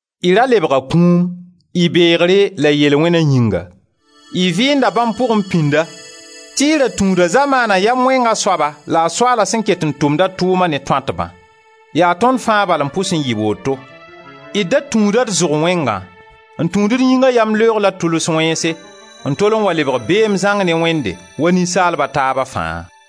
Y ra lebga kũum, y beegre la y yel-wẽna yĩnga, Y vɩɩnda bãmb pʋgẽ pĩnda tɩ y ra tũuda zamaana yam wẽnga soaba la a soaala, sẽn ket n tʋmda a tʋʋma ne tõatbã. Yaa tõnd fãa bal n pʋs n yɩ woto; d da tũuda d zʋg wẽnga, n tũud d yĩnga yamleoog la d tʋls wẽnse n tol n wa lebg beem zãng ne Wẽnde, wa ninsaalb a taaba fãa.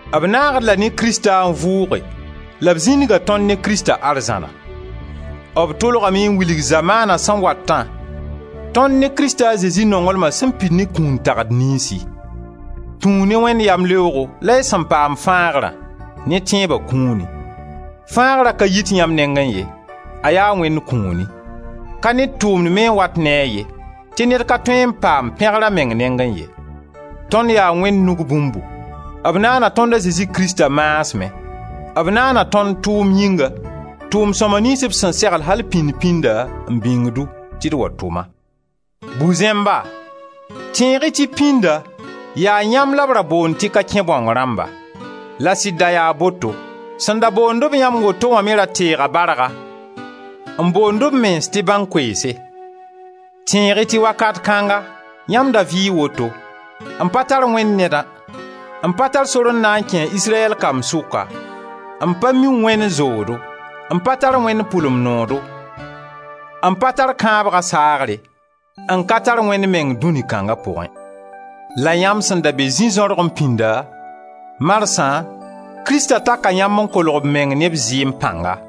B naagd-d la ne Krista n vʋʋge la b zĩndiga tõnd ne Krista arzãna. B tʋlgame n wilg zamaana sẽn watã tõnd ne Krist a Zezi nonglma sẽn pid ne kũun tagd niynsi. Tũu ne Wẽnd yamleoogo la y sẽn paam fãagrã, ne tẽeba kũuni. Fãagra ka yit yãmb nengẽ ye, a yaa Wẽnd kũuni. Ka ned tʋʋmd me n wat ne a ye, tɩ ned ka tõe n paam pẽgr a meng nengẽ ye. Tõnd yaa Wẽnd nug bũmbu, b naana tõnd a Zezi Krista maasmẽ, b naana tõnd tʋʋm yĩnga, tʋʋm-sõma niyns b sẽn segl al pĩnd-pĩnda n bĩng-du tɩ d wa tʋma. Bu-zẽmba, tẽeg-y tɩ pĩnda yaa yãmb la b ra boond tɩ ka kẽ-bãong rãmba — la sɩd da yaa boto. Sẽn da boond-b yãmb woto wã me ra teega barga n boond b mens tɩ bãnkomse. Tẽeg-y tɩ wakat kãnga yãmb da vɩɩ woto, n pa tar Wẽnd Nedã, n pa tar sor n na n kẽ a Israyɛl kamb sʋka, n pa mi Wẽnd zoodo, n pa tar Wẽnd pʋlem noodo, n pa tar kãabga saagre, n ka tar Wẽnd meng dũni kãnga pʋgẽ! La yãmb sẽn da be zĩ-zãorgẽ pĩnda, marsã Krista taka yãmb n kolg b meng ne b zɩɩm pãnga.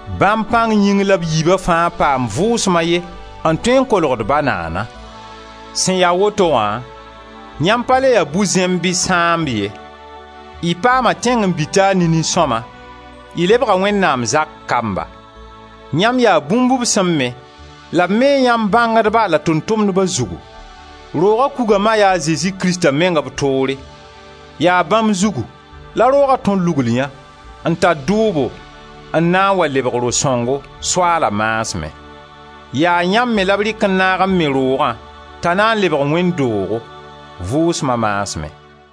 Bãmb pãng yĩng la d yiiba fãa paam Vʋʋsma a ye n tõe n kolg d Ba naana. Sẽn ya woto wã, yãmb pa le ya bu-zẽmb bɩ sãamb ye, y paama tẽngen-bi-taar ne nin-sõma, y lebga Wẽnnaam zak kamba. Yãmb yaa bũmb b sẽn me la b mee yãmb bãngdba la tʋʋm-tumdba zugu. Rooga kuga ma yaa a Zezi Krista meng b toore. Yaa bãmb zugu la rooga tõr lugl yã n tar dʋʋbo n na n wa lebg Ro-sõngo, Soaala maasmẽ. Yaa yãmb me la b rɩk n naag n me Roogã t'a na n lebg wẽnd doog, Vʋʋsma maasmẽ.